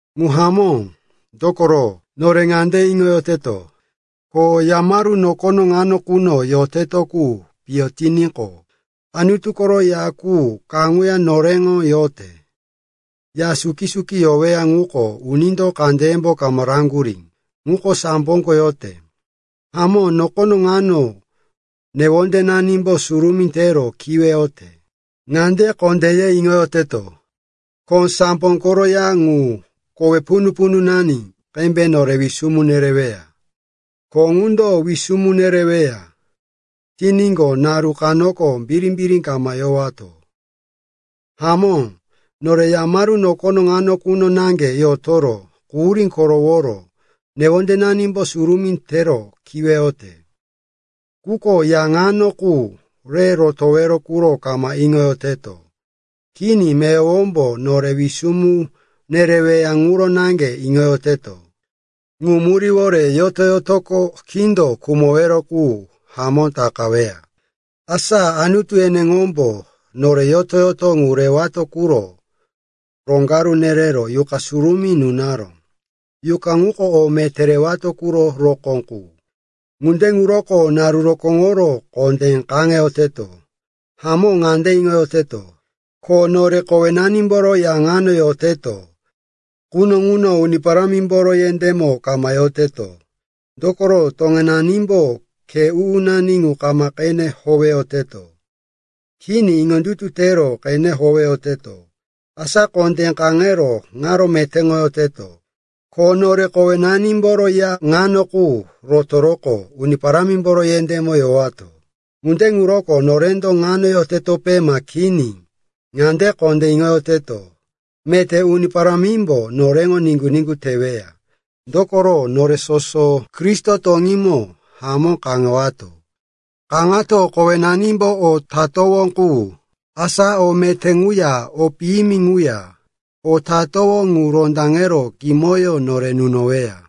Ŋu hamó, dokoro, nore ŋande iŋoyoteto, ko yamaru nokono ŋano quno yoteto qu piyo tiníqo, Anutu koro ya qu kaŋuya noreŋo yote. Ya suki-suki yoweya ŋuko unindo kandeyembo kama raŋgurí, ŋuko samboko yote. Hamó, nokono ŋano newondenanimbo surumí tero kiweyote. Ŋande kondé ye iŋoyoteto, ko sambo koro ya ŋu, kowe punu-pununani qembe nore wisumu nereweya. Ko ŋundo wisumu nereweya tiníqo, naru kanoko birimbiri kama yowato. Hamó, nore yamaru nokono ŋano quno naŋge yotoro, quhurí koroworo newondenanimbo surumí tero kiweyote. Quko ya ŋano qu re rotowero ŋuro kama iŋoyoteto. Kini, meyowombo nore wisumu nereweya ŋuro naŋge iŋoyoteto. Ŋu muríwore yoto-yotoko kindo khumowero qu hamó takaweya. Asa Anutu eneŋombo nore yoto-yoto ŋu rewato quro roŋgaru nerero Yuqa Surumí nunaró. Yuqa ŋuko o meté rewato ŋuro rokó qu. Ŋunde ŋuroko naru rokóŋoro kondé kaŋeyoteto. Hamó, ŋande iŋoyoteto, ko nore kowenanimboro ya ŋano yoteto quno ŋuno Uni Parámimboro yendémo kama yoteto. Dokoro toŋenanimbo khe u-unani ŋu kama qene howeyoteto. Kini, iŋondutu tero qene howeyoteto. Asa kondé kaŋero ŋaro metéŋoyoteto, ko nore kowenanimboro ya ŋano qu rotoroqo Uni Parámimboro yendémo yowato. Ŋunde ŋuroko norendo ŋano yotetope ma kini, ŋande kondé iŋoyoteto, meté Uni Parámimbo noreŋo niŋgu-niŋgu teweya. Dokoro nore soso Kristo toŋímo hamó kaŋewato. Kaŋato kowenanimbo o tatowó qu, asa o meté ŋuya o piyimi ŋuya, o tatowó ŋu rondaŋero kimoyó nore nunoweya.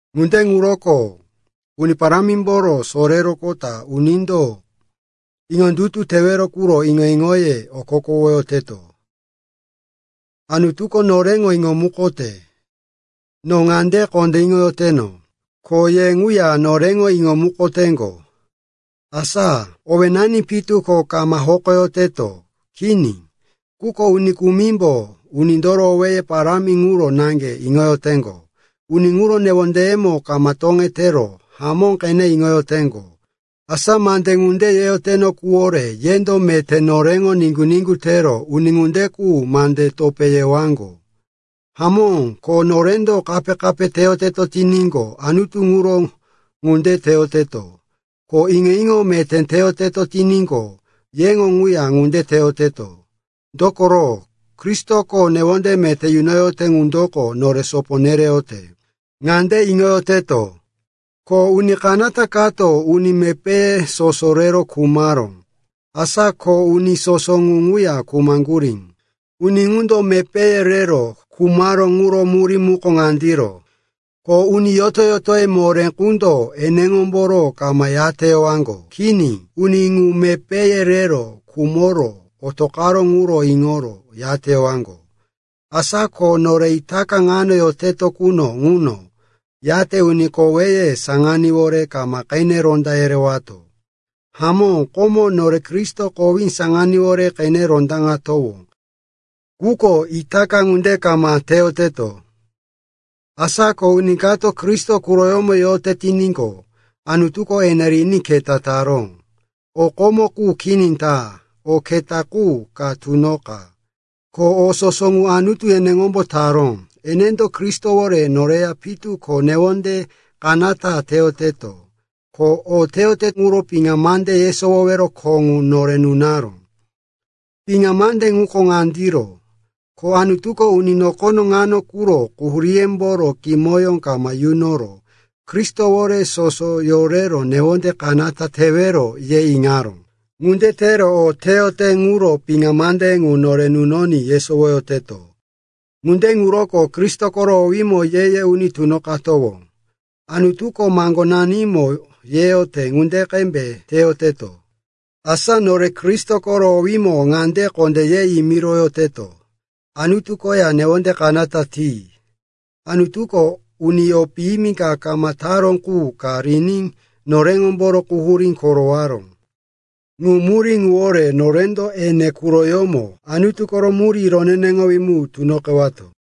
Ŋunde ŋuroko Uni Parámimboro soreroqota unindo iŋondutu tewero quro iŋo-iŋoye okokowoyoteto. Anutuko noreŋo iŋomukote; no ŋande kondé iŋoyoteno, ko ye ŋuya noreŋo iŋomukoteŋgo. Asa owénani pitu ko kama hokoyoteto, kini. Quko uni kumimbo unindoro owéye parámi ŋuro naŋge iŋoyoteŋgo, uni ŋuro newondeyemo kama toŋetero hamó qene iŋoyoteŋgo. Asa mande ŋunde yeteno quwore yendo meté noreŋo niŋgu-niŋgu tero uni ŋunde qu mande topé yewaŋgo. Hamó, ko norendo kape-kape teyoteto tiníqo, Anutu ŋuro ŋunde teyoteto. Ko iŋo-iŋo meté teyoteto tiníqo, yeŋo ŋuya ŋunde teyoteto. Dokoro Kristoko newonde meté nunoyote ŋundoko nore sopo nereyote. Ŋande iŋoyoteto, ko uni kanata kato uni mepéye soso rero khumaró, asa ko uni soso ŋu ŋuya khumaŋgurí. Uni ŋundo mepéye rero khumaró ŋuro murí muko ŋandiro, ko uni yoto-yotoye moré qundo eneŋomboro kama yateyowaŋgo. Kini, uni ŋu mepéye rero khumoro otoqaró ŋuro iŋoro yateyowaŋgo. Asa ko nore itaka ŋano yoteto quno ŋuno yate uni koweye saŋaníwore kama qene ronda yerewato. Hamó, komo nore Kristo kowí saŋaníwore qene rondaŋatowó, quko itaka ŋunde kama teyoteto. Asa ko uni kato Kristo quroyómo yote tiníqo, Anutuko ene riní keta taró. O komo qu kini ta, o keta qu ka tunoqa. Ko o soso ŋu Anutu eneŋombo taró. Enendo Kristowore noreya pitu ko newonde kanata teyoteto, ko o teyote ŋuro piŋa mande yesowowero kho ŋu nore nunaró. Piŋa mande ŋuko ŋandiro, ko Anutuko, uni nokono ŋano quro quhuríyemboro kimoyó kama yunoro Kristowore soso yorero newonde kanata tewero, ye iŋaró. Ŋunde tero o teyote ŋuro piŋa mande ŋu nore nunoní yesowoyoteto. Ŋunde ŋuroko Kristo koro owímo ye-ye uni tunoqatowó, Anutuko maŋgonanimo yeyote ŋunde qembe teyoteto. Asa nore Kristo koro owímo ŋande kondé ye yimiroyoteto, “Anutu koya newonde kanata ti.” Anutuko uni o piyimi ka kama taró qu ka riní noreŋomboro quhurí korowaró. Ŋu murí ŋuwore norendo ene quroyómo Anutu koro murí roneneŋowí mu tunoqewato.